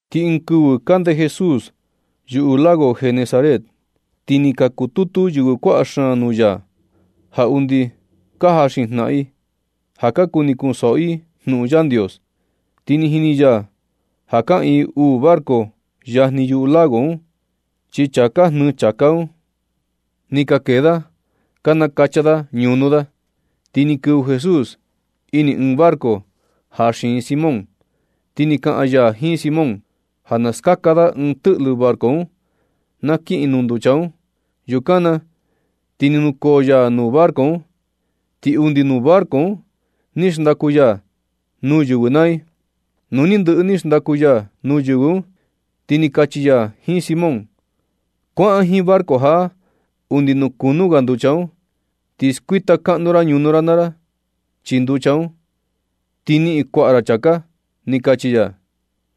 Ti ɨɨn kɨvɨ kande Jesús yuꞌu lago Genesaret. Ti ni ka kututu yɨvɨ kuaꞌa xaan nuu ya ja undi ka jaxin jnaꞌan i, ja ka kuni kunsoꞌo i jnuꞌun Yandios. Ti ni jini ya ja kaꞌiin uu barco yajni yuu lago un, chi chaa ka jnɨɨ chāká un, ni ka kee da ka nakacha da ñunu da. Ti ni kɨvɨ Jesús ini ɨɨn barco ja xiin Simón, ti ni kaꞌan ya jiin Simón ja na skaka da ɨɨn tɨꞌlɨ barco un na kiꞌin nuu nducha un. Yukan na ti ni nukoo ya nuu barco un, ti undi nuu barco un ni xndaku ya nuu yɨvɨ naa i. Nu ni ndɨꞌɨ ni xndaku ya nuu yɨvɨ un, ti ni kachi ya jiin Simón: ―Kuaꞌan jiin barco jaꞌa undi nuu kunú ga nducha un, ti skuita kaꞌnu ra ñunu ra naa ra chii nducha un, ti niꞌin kuaꞌa ra chāká ―ni kachi ya.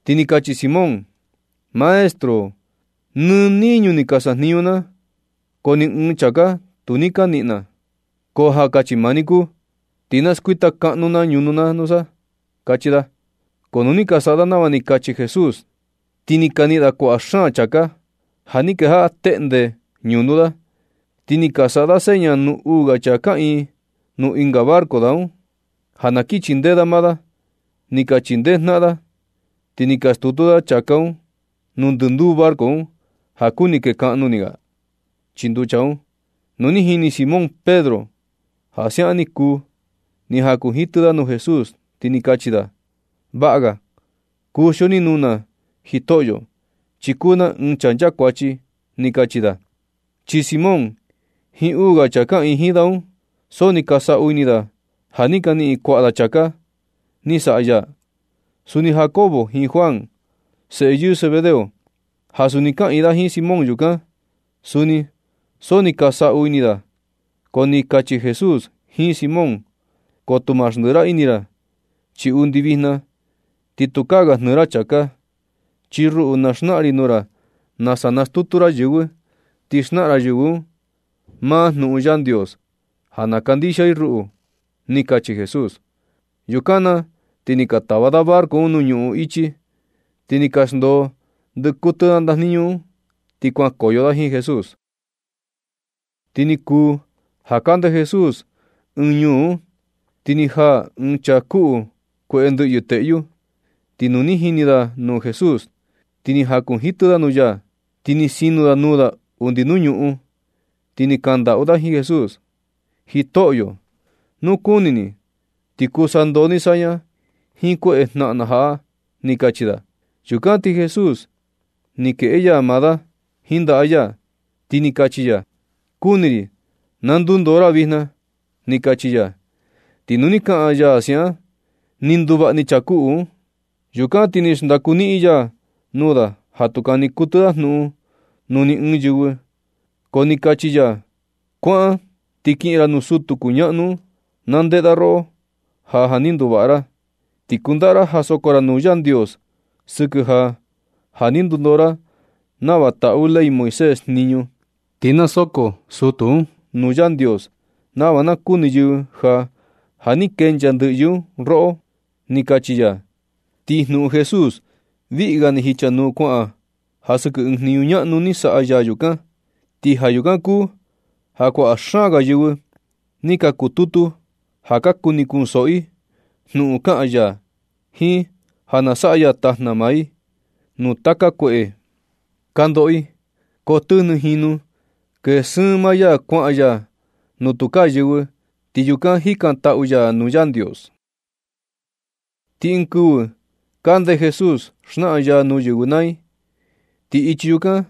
Ti ni kachi Simón: ―Maestro, nɨ niñu ni ka sajniñu na, ko ni ɨɨn chāká tu ni ka niꞌin na. Ko ja kachi maa ni kuu, ti na skuita kaꞌnu na ñunu na nusa ―kachi da. Ko nu ni ka saꞌa da nava ni kachi Jesús, ti ni ka niꞌin da kuaꞌa xaan chákā ja ni kejaꞌa teꞌnde ñunu da un. Ti ni ka saꞌa da seña nuu uu ga chaa kaꞌiin nuu ɨnga barco da, ja na kin chindee da maa da. Ni ka chindee jnaꞌan da ti ni ka skutu da chāká nuu ndɨnduu barco un, ja kuni kekaꞌnu ni ga chii nducha un. Nu ni jini Simón Pedro ja siaꞌan ni kuu, ni jakunjitɨ da nuu Jesús, ti ni kachi da: ―Vaꞌa ga kuxio ni nuu na Jitoꞌyo, chi kuu na ɨɨn chaa nchakuachi ―ni kachi da. Chi Simón jiin uu ga chaa kaꞌiin jiin da un, so ni ka saꞌu ini da ja ni ka niꞌin kuaꞌa da chāká ni saꞌa ya. Suni Jacobo jiin Juan, seꞌe yɨɨ Zebedeo, ja suni kaꞌiin da jiin Simón yukan. Suni so ni ka saꞌu ini da. Ko ni kachi Jesús jiin Simón: ―Koto ma xndɨꞌɨ ini ra, chi undi vijna ti tukaa ga jnɨɨ ra chāká, chi ruꞌu na xnaꞌan ri nuu ra nasa nastutu ra yɨvɨ, ti xnaꞌan ra yɨvɨ un maa jnuꞌun Yandios ja na kandixia i ruꞌu ―ni kachi Jesús. Yukan na ti nu ni ka tava da barco un nuu ñuꞌun ichi, ti ni ka xndoo ndɨꞌɨ kuɨtɨ da ndajniñu un, ti kuankoyo da jiin Jesús. Ti ni kuu ja kande Jesús ɨɨn ñuu un, ti ni jaa ɨɨn chaa kuꞌu kueꞌe ndɨꞌyɨ teꞌyu. Ti nu ni jini da nuu Jesús, ti ni jankunjitɨ da nuu ya, ti ni sino da nuu da undi nuu ñuꞌun, ti ni kandaꞌu da jiin Jesús: ―Jitoꞌyo, nu kuni ni, ti kuu sandoo ni saña jiin kueꞌe jnaꞌan na jaꞌa―ni kachi da. Yukan ti Jesús ni kueꞌe ya maa da jiin ndaꞌa ya, ti ni kachi ya: ―Kuni ri, na ndundoo ra vijna ―ni kachi ya. Ti nu ni kaꞌan ya siaꞌan, ni nduvaꞌa ni chaa kuꞌu un. Yukan ti ni xndaku niꞌin ya nuu da ja tu kani kuɨtɨ da jnuꞌun nuu ni ɨɨn yɨvɨ. Ko ni kachi ya: ―Kuaꞌan ti kiꞌin ra nuu sutu kuñaꞌnu un, na ndeꞌe da roꞌo ja, ja ni nduvaꞌa ra. Ti kundaꞌa ja soko ra nuu Yandios sɨkɨ ja, ja ni ndundoo ra nava taꞌu ley Moisés jniñu. Ti na soko sutu un nuu Yandios, nava na kuni yɨvɨ ja, ja ni kenchaa ndɨꞌyɨ un roꞌo ―ni kachi ya. Ti jnuꞌun Jesús, viꞌi ga ni jichanuu kuaꞌan ja sɨkɨ ɨɨn jniñu ñaꞌnu ni saꞌa ya yukan. Ti ja yukan kuu ja kuaꞌa xaan ga yɨvɨ ka kututu ja ka kuni kunsoꞌo i jnuꞌun kaꞌan ya, jiin ja na saꞌa ya tajna maa i, nuu taka kueꞌe ka ndoꞌo i. Ko tɨjnɨ jinu kee sɨɨn maa ya kuaꞌan ya nuu tukaa yɨvɨ, ti yukan jikantaꞌu ya nuu Yandios. Ti ɨɨn kɨvɨ kande Jesús xnaꞌan ya nuu yɨvɨ naa i, ti ichi chukan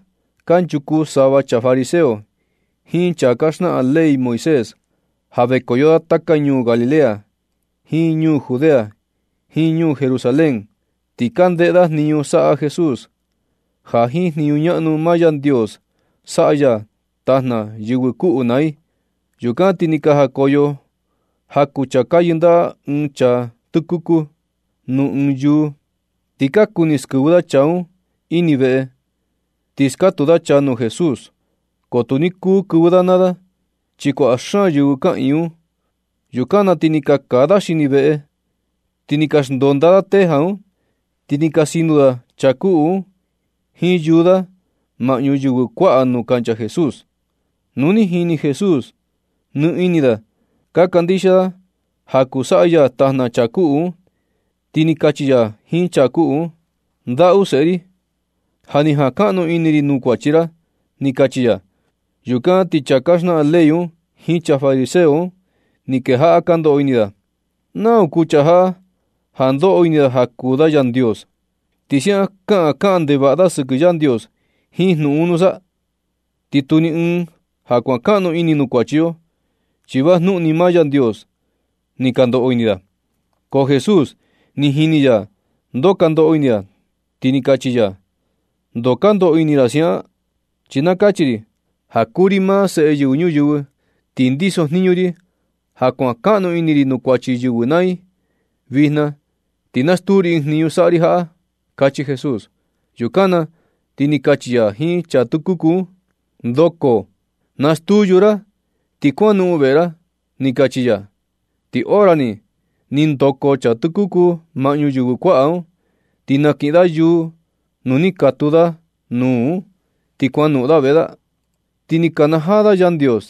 kanchuku sava chaa fariseo jiin chaa ka xnaꞌan ley Moisés ja vekoyo da taka ñuu Galilea, jiin ñuu Judea, jiin ñuu Jerusalén. Ti ka ndeꞌe da jniñu saꞌa Jesús, ja jiin jniñu ñaꞌnu maa Yandios saꞌa ya tajna yɨvɨ kuꞌu naa i. Yukan ti ni ka jakoyo jaku chaa ka yɨndaꞌa ɨɨn chaa tɨkuku nuu ɨɨn yúú, ti ka kuni skɨvɨ da chaa un ini veꞌe, ti skatu da chaa nuu Jesús. Ko tu ni kuu kɨvɨ da naa da, chi kuaꞌa xaan yɨvɨ kaꞌiin un. Yukan na ti ni ka kaa da xini veꞌe, ti ni ka xndonda da teja un, ti ni ka sino da chaa kuꞌu un jiin yúú da maꞌñu yɨvɨ kuaꞌa un nuu kancha Jesús. Nu ni jini Jesús ja ni ini da ka kandixia da ja kuu saꞌa ya tajna chaa kuꞌu un, ti ni kachi ya jiin chaa kuꞌu un: ―Ndaꞌu seꞌe ri, ja ni jankaꞌnu ini ri nuu kuachi ra ―ni kachi ya. Yukan na ti chaa ka xnaꞌan ley un jiin chaa fariseo un ni kejaꞌa ka ndoꞌo ini da: ―¿Nau kuu chaa jaꞌa ja ndoꞌo ini da ja kuu da Yandios, ti siaꞌan kaꞌan kaꞌan ndevaꞌa da sɨkɨ Yandios jiin jnuꞌun un nusa? Ti tu ni ɨɨn ja kuankaꞌnu ini nuu kuachi yo, chi vajnuꞌun ni maa Yandios ―ni ka ndoꞌo ini da. Ko Jesús ja ni jini ya ndoo ka ndoꞌo ini da, ti ni kachi ya: ―¿Ndoo ka ndoꞌo ini ra siaꞌan? Chi na kachi ri ja kuu ri maa Seꞌe Yɨvɨ Ñuyɨvɨ, ti ndiso jniñi ri ja kuan kaꞌnu ini ri nuu kuachi yɨvɨ naa i. Vijna ti na stuu ri ɨɨn jniñu saꞌa ri jaꞌa ―kachi Jesús. Yukan na ti ni kachi ya jiin chaa tɨkuku un: ―Ndoko, nastuu yúú ra, ti kuanoꞌon veꞌe ra ―ni kachi ya. Ti hora ni, ni ndoko chaa tɨkuku un maꞌñu yɨvɨ kuaꞌa un, ni nakiꞌin da yúú nu ni katuu da nuu un, ti kuanoꞌon da veꞌe da. Ti ni nakanajaa da Yandios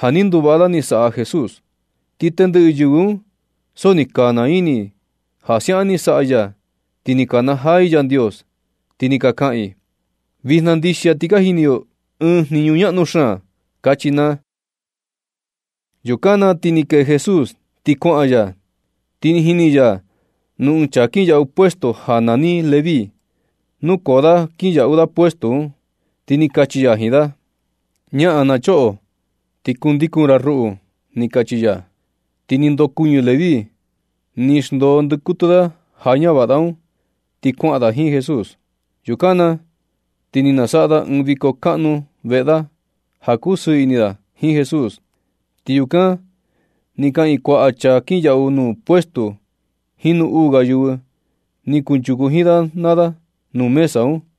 ja ni nduvaꞌa da ni saꞌa Jesús. Ti tendɨꞌɨ yɨvɨ un so ni ka naa ini i ja siaꞌan ni saꞌa ya. Ti ni ka kanajaa i Yandios, ti ni ka kaꞌan i: ―Vijna ndixia ti ni ka jini yo ɨɨn jniñu ñaꞌnu xaan ―kachi naa. Yukan na ti ni kee Jesús ti kuaꞌan ya, ti ni jini ya nuu ɨɨn chaa kinyaꞌu puesto ja nani Leví, nukoo da nuu kinyaꞌu puestu un, ti ni kachi ya jiin da: ―Ñaꞌan na choꞌo, ti kundikun ra ruꞌu ―ni kachi ya. Ti ni ndokuɨñɨ Leví, ni xndoo ndɨkuɨtɨ da ja ñavaꞌa da un, ti kuaꞌan da jiin Jesús. Yukan na ti ni nasaꞌa da ɨɨn viko kaꞌnu veꞌe da ja kusɨɨ ini da jiin Jesús, ti yukan ni kaꞌiin kuaꞌa chaa ka kinyaꞌu nuu puestu jiin uu ga yɨvɨ ni kunchuku jiin da naa da nuu mesa un.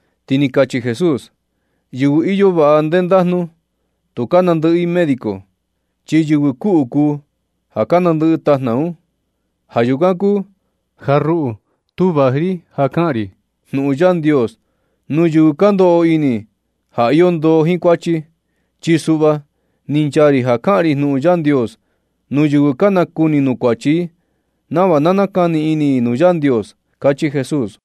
Ti ni kachi Jesús: ―Yɨvɨ iyo vaꞌa ndendajnu, tu ka nandɨꞌɨ i médico, chi yɨvɨ kuꞌu kuu ja ka nandɨꞌɨ tajna un. Ja yukan kuu ja ruꞌu tu vaji ri ja kaꞌan ri jnuꞌun Yandios nuu yɨvɨ ka ndoꞌo ini ja iyo ndoo jiin kuachi. Chi suꞌva ni nchaa ri ja kaꞌan ri jnuꞌun Yandios nuu yɨvɨ ka nakuni nuu kuachi i nava nakani ini i nuu Yandios ―kachi Jesús.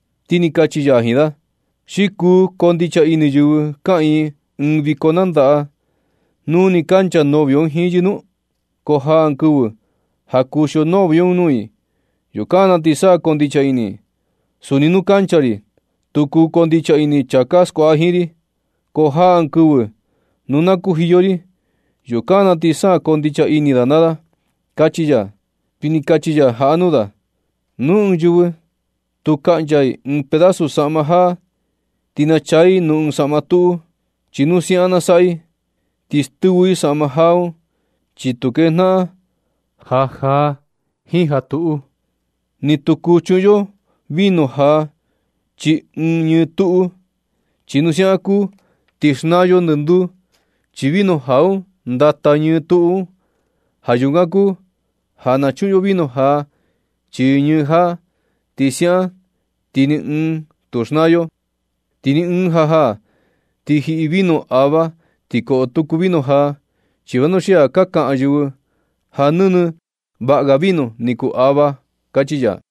Ti ni kachi ya jiin da: ―¿Xi kuu koo ndicha ini yɨvɨ kaꞌiin ɨɨn viko nandaꞌa nu nɨ kancha novio un jiin yɨ nu? Ko jaa ɨɨn kɨvɨ ja kuxio novio nuu i. Yukan na ti sa na koo ndicha ini i. Suni nu kancha ri, tu kuu koo ndicha ini chaa ka skuaꞌa jiin ri. Ko jaa ɨɨn kɨvɨ nu na kujiyo ri, yukan na sa na koo ndicha ini da naa da ―kachi ya. Ti ni kachi ya jaꞌa nuu da: ―Ni ɨɨn yɨvɨ tu kaꞌncha i ɨɨn pedasu saꞌma jaa ti nachaa i nuu ɨɨn saꞌma tuꞌu. Chi nu siaꞌan na saꞌa i, ti stɨvɨ i saꞌma jaa un, chi tu kejnaꞌan ja jaa jiin ja tuꞌu. Ni tu kuu chuꞌun yo vino jaa chii ɨɨn ñɨɨ tuꞌu. Chi nu siaꞌan na kuu ti xnaa yo ndɨnduu. Chi vino jaa un ndata ñɨɨ tuꞌu un. Ja yukan kuu ja na chuꞌun yo vino jaa chii ñɨɨ jaa, chi siaꞌan ti ni ɨɨn tu xnaa yo. Ti ni ɨɨn ja ja ni jiꞌi vino ava ti koꞌo tuku vino jaa, chi vanuxia ka kaꞌan yɨvɨ ja nɨnɨ vaꞌa ga vino ni kuu ava ―kachi ya.